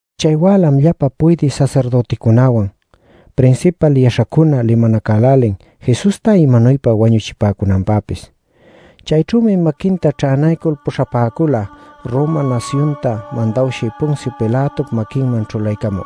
Chay wälam llapa puydï sasirdüticunawan, prinsipal yaśhacuna limanacälälin Jesusta imanuypa wañuchipäcunanpäpis. Chayćhümi maquinta ćhänaycul puśhapäcula Roma nasyunta mandawshï Poncio Pilatop maquinman ćhulaycamü.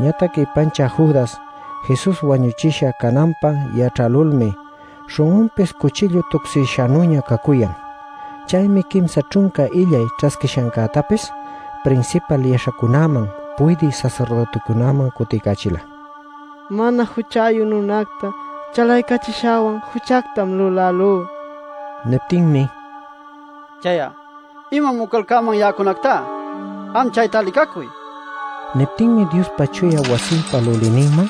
Ñatac ipanchä Judas, Jesus wañuchisha cananpä yaćhälulmi śhun'unpis cuchillu tucsïshanüña cacuyan. Chaymi quimsa ćhunca illay ćhasquishancätapis prinsipal yaśhacunaman, puydï sasirdüticunaman cutiycachila: “Mana juchayu nunacta chalaycachishäwan juchactam lulälú” nil. Niptinmi “Chay'a ¿imam ucalcäman ya'acunactá? Am chayta licacuy” nin. Niptinmi Diospa chuya wasinpa lulïninman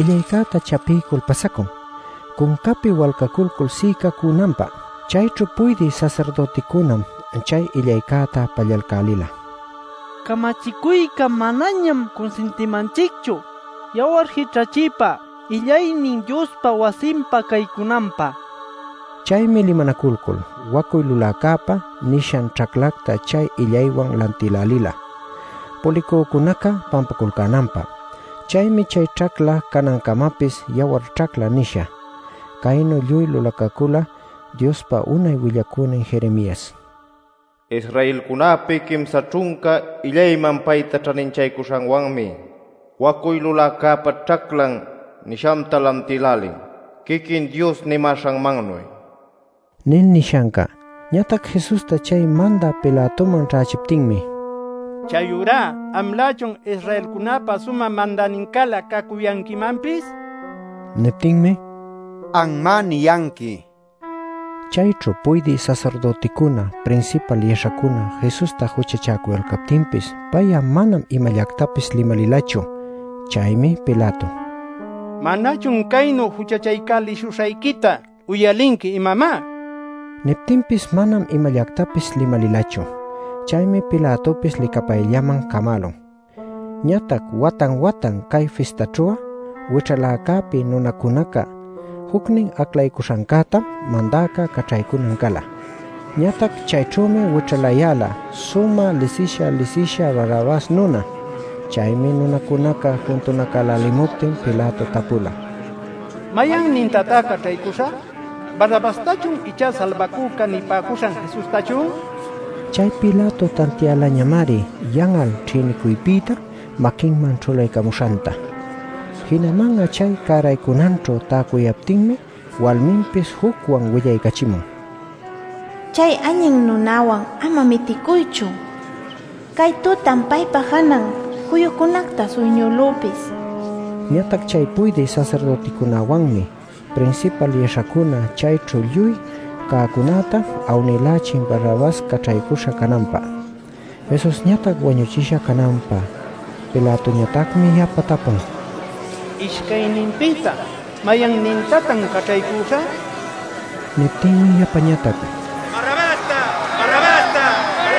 illaycäta chapiycul pasacun cuncapi walcaculcul si'icäcunanpä. Chayćhu puydï sasirdüticunam chay illaycäta pallalcälila: “Camachicuyca manañam cunsintimanchicchu yawar jićhachiypa illaynin Diospa wasinpa caycunanpä” nil. Chaymi limanaculcul “Wacuy luläcäpa” nishan ćhacläta chay illaywan lantïlälila pulicücunaca pampaculcänanpä. Chaymi chay ćhacla canancamapis “Yawar Ćhacla” nisha. Caynu lluy lulacacüla Diospa unay willacünin Jeremias: “Israelcunäpi quimsa ćhunca illayman payta ćhaninchaycuśhanwanmi ‘wacuy luläcäpa ćhaclan’ nishanta lantïlälin, quiquin Dios nimäśhanmannuy” nil nishanca. Ñatac Jesusta chay mandä Pilatoman ćhächiptinmi: “¿Chayurá amlächun Israelcunäpa sumä mandänincälä cacuyanquimanpis?” nin. Niptinmi: “Anmá niyanqui” nin. Chayćhu puydï sasirdüticuna, prinsipal yaśhacuna Jesusta juchachäcuyalcaptinpis, pay'a manam imallactapis limalilachu. Chaymi Pilato: “¿Manachun caynu juchachaycälishuśhayquita uyalinqui, imamá?” nin. Niptinpis manam imallactapis limalilachu. Chaymi Pilatopis licapayllaman camälun. Ñatac watan-watan cay fistaćhu'a wićhaläcäpi nunacunaca jucnin aclaycuśhancätam mandäca caćhaycunan cala. Ñatac chayćhümi wićhalayäla sumä lisisha lisisha Barrabas nuna. Chaymi nunacunaca juntunacälälimuptin Pilato tapula: “¿Mayannintatá caćhaycüśhä? ¿Barrabastachun icha ‘Salbacüca’ nipäcuśhan Jesustachun?” nil. Chay Pilato tantiälañamari yan'al ćhïnicuypïta maquinman ćhulaycamuśhanta. Jinaman'a chay cäraycunanćhu täcuyaptinmi walminpis jucwan willaycachimun: “Chay allin nunawan ama miticuychu. Cay tutam paypa janan juyucunacta suyñülüpis” nil. Ñatac chay puydï sasirdüticunawanmi, prinsipal yaśhacuna chayćhu lluy cäcunäta awnïlächin Barrabas caćhaycuśha cananpä, Jesusñatac wañuchisha cananpä. Pilatoñatacmi yapa tapun: “¿Ishcayninpïta mayannintatan caćhaycüśhä?” nil. Niptinmi yapañatac: “¡Barrabasta!” nicuyalcan.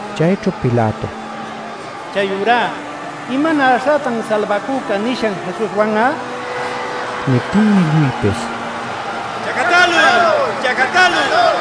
Chayćhu Pilato: “Chayurá ¿imanäśhätan ‘Salbacüca’ nishan Jesuswan'a?” nin. Niptinmi lluypis: “¡Chacatäluy!” nicuyalcan.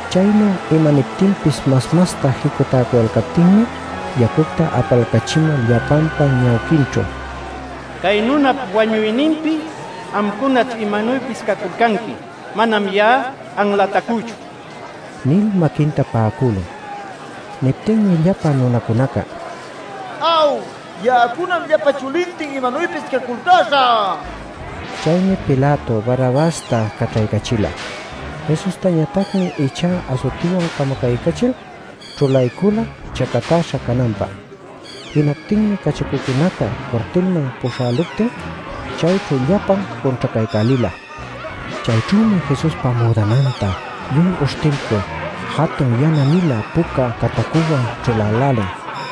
Chaynu imaniptinpis mas-masta jicutäcuyalcaptinmi yacucta apalcachimul llapanpa ñawquinćhu: “Cay nunap wañuyninpi amcunaćh imanuypis caculcanqui; manam ya'a anlatacüchu” nil maquinta pa'acülun. Niptinmi llapa nunacunaca: “Aw, ya'acunam llapa chulintin imanuypis caculcäśhä” nin. Chaymi Pilato Barrabasta caćhaycächila; Jesustañatacmi ichá asutiwan camacaycachil ćhulaycula chacatäśha cananpä. Jinaptinmi cachacucunaca cuartilman puśhäluptin chayćhu llapan cunćhacaycälila. Chayćhümi Jesuspa müdananta lluy uśhtilcul jatun yana-nilä puca catacunwan ćhulälälin.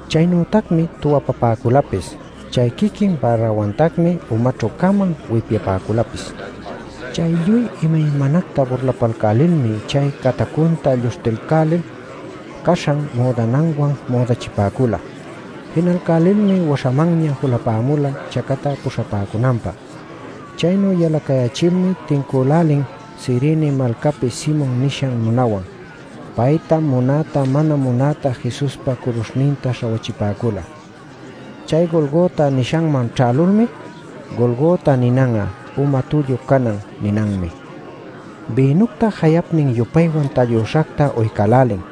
Chaynütacmi tuwapapäculapis, chay quiquin bärawantacmi umaćhü-cama wipyapäculapis. Chay lluy imaymanacta burlacalcälilmi chay catacunta lluśhtilcälil caśhan müdananwan müdachipäcula. Jinalcälilmi waśhamanña julapämula chacatä puśhapäcunanpä. Chaynu yalacayächilmi tincülälin Cirene malcapi Simon nishan nunawan. Paytam munäta mana munäta Jesuspa curuśhninta śhawachipäcula. Chay Golgota nishanman ćhälulmi (Golgota ninan'a “uma tullu canan” ninanmi) bïnucta jayapnin-yupaywan tallüśhacta uycälälin.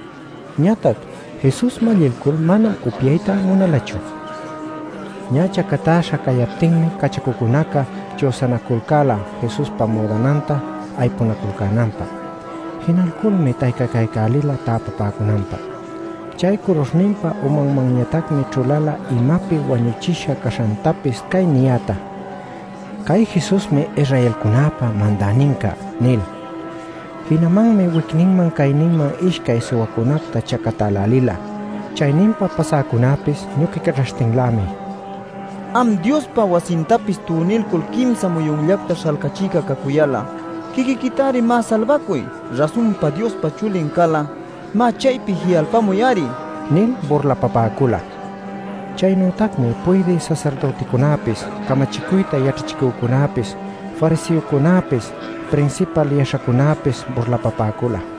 Ñatac Jesus mallilcul manam upyayta munalachu. Ñä chacatäśha cayaptinmi cachacucunaca chüsanaculcäla Jesuspa müdananta aypunaculcänanpä. Jinalculmi taycacaycälila täpapäcunanpä. Chay curuśhninpa umanmanñatacmi ćhuläla imapi wañuchisha caśhantapis cay niyäta: “Cay Jesusmi Israelcunäpa Mandäninca” nil. Jinamanmi wicninman cayninman ishcay suwacunacta chacatälälila. Chayninpa pasäcunäpis ñuquicaćhaśhtinlämi: “Am Diospa wasintapis tunilcul quimsa muyunllacta śhalcachïca cacuyal'a, quiquiquitari má salbacuy. Rasunpa Diospa Chulin cal'a má chaypi ji'alpamuy-ari” nil burlapapäcula. Chaynütacmi puydï sasirdüticunäpis, camachicuyta yaćhachicücunäpis, fariseocunäpis, prinsipal yaśhacunäpis burlapapäcula: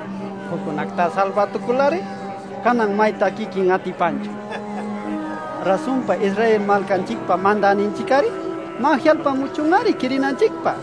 “Juccunactá salbätucul-ari, canan maytá quiquin atipanchu. Rasunpa Israel malcanchicpa mandäninchic-ari, má, ji'alpamuchun-ari quirinanchicpä.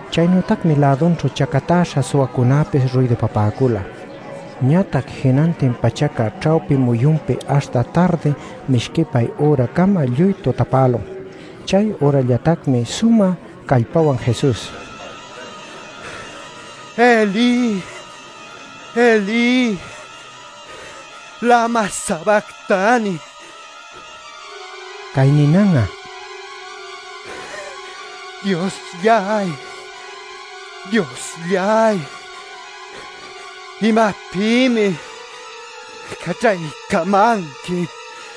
Chaynütacmi lädunćhu chacatäśha suwacunäpis ruydupapäcula. Ñatac jinantin pachaca ćhawpi muyunpi aśhta tardi mishquipay üracama lluy tutapälun. Chay ürallatacmi sumä callpawan Jesus: “¡Elí, Elí, lama sabactani!” nila. (Cay ninan'a “Dioslláy, Dioslláy ¿imapïmi caćhaycamanqui?” ninanmi.)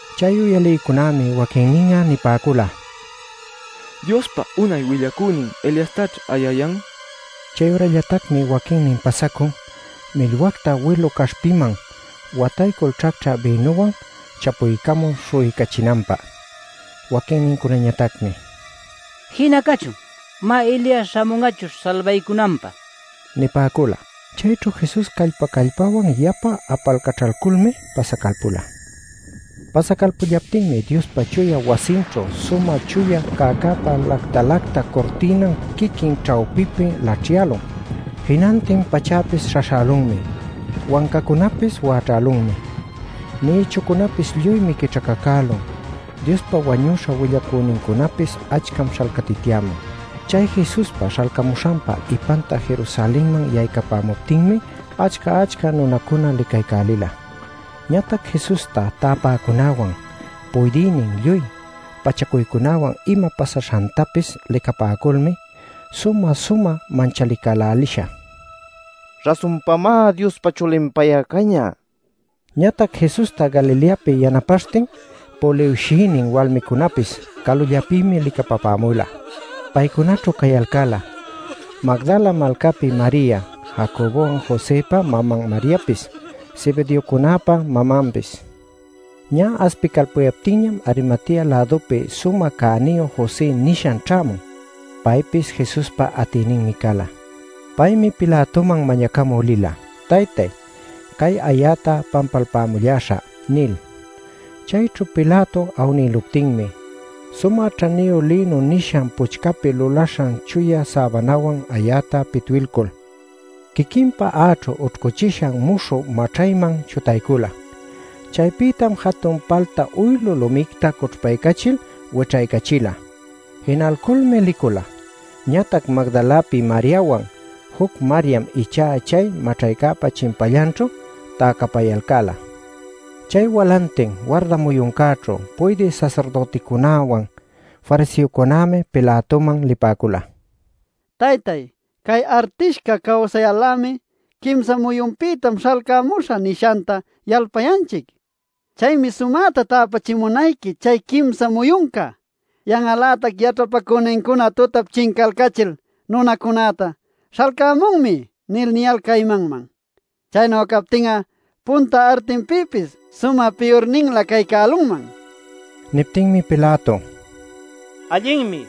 Chay uyalïcunämi waquinnin'a nipäcula: “Diospa unay willacünin Eliastaćh ayayan” nil. Chayürallatacmi waquinnin pasacun millwacta wilu caśhpiman wataycul ćhacćhä bïnuwan chapuycamul śhu'uycachinanpä. Waquinnincunañatacmi: “Jina cachun. Má, Elias śhamun'achuśh salbaycunanpä” nipäcula. Chayćhu Jesus callpa-callpawan yapa apalcaćhalculmi pasacalpula. Pasacalpullaptinmi Diospa chuya wasinćhu sumä chuya cäcäpa lacta-lacta curtïnan quiquin ćhawpipi laćhyälun. Jinantin pachäpis śhaśhälunmi, wancacunapis wäćhälunmi. Nïchucunäpis lluymi quićhacacülun; Diospa wañüśha willacünincunapis achcam śhalcatityämun. ( Chay Jesuspa śhalcamuśhanpa ipanta Jerusalenman yaycapäcuptinmi achca-achca nunacuna licaycälila.) Ñatac Jesusta täpäcunäwan puydïnin lluy pachacuycunawan ima pasaśhantapis licapäculmi sumä-sumä manchalicälälisha: “Rasunpamá Diospa Chulin pay'a cañä” nipäcula. Ñatac Jesusta Galileapi yanapaśhtin puliwshïnin walmicunäpis calullapïmi licapapämula. Paycunaćhu cayalcäla: Magdala malcapi Maria, Jacobopwan Josëpa maman Mariapis, Zebedeocunäpa mamanpis. Ñä aspicalpuyaptinñam Arimatea-lädupi sumä cäniyu José nishan ćhämun. Paypis Jesuspa atïninmi cala. Paymi Pilatoman mañacamü lila “Taytay, cay ayäta pampalpamulläśhä” nil. Chayćhu Pilato awnilcuptinmi sumä ćhaniyu lïnu nishan puchcapi lulaśhan chuya säbanawan ayäta pitwilcul quiquinpa a'aćhu ućhcuchishan muśhü maćhayman chutaycula. Chaypïtam jatun palta uylu lumicta cućhpaycachil wićhaycachila. Jinalculmi licula. Ñatac Magdalapi Mariawan juc Mariam ichá chay maćhaypa chimpallanćhu täcapayalcäla. Chay walantin, warda muyuncäćhu, puydï sasirdüticunäwan fariseocunämi Pilatoman lipäcula: “Taytay, cay artishca cawsayal-lämi ‘Quimsa muyunpïtam śhalcamuśhä’ nishanta yalpayanchic. Chaymi sumäta täpachimunayqui chay quimsa muyunca. Yan'al-lätac yaćhapacünincuna tutap chincalcachil, nunacunäta ‘Śhalcämunmi’ nil niyalcä imanman. Chaynu captin'a punta artinpïpis sumä piyurninlä cay cälunman” nipäcula. Niptinmi Pilato: “Allinmi.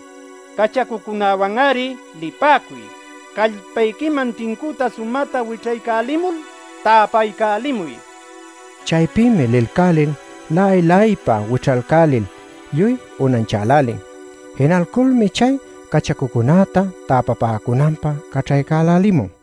Cachacucunäwan-ari lipäcuy. Callpayquiman tincüta sumäta wićhaycälimul, täpaycälimuy” nin. Chaypïmi lilcälil la'ay-la'aypa wićhaycälil lluy unanchälälin. Jinalculmi chay cachacucunäta täpapäcunanpä caćhaycälälimun.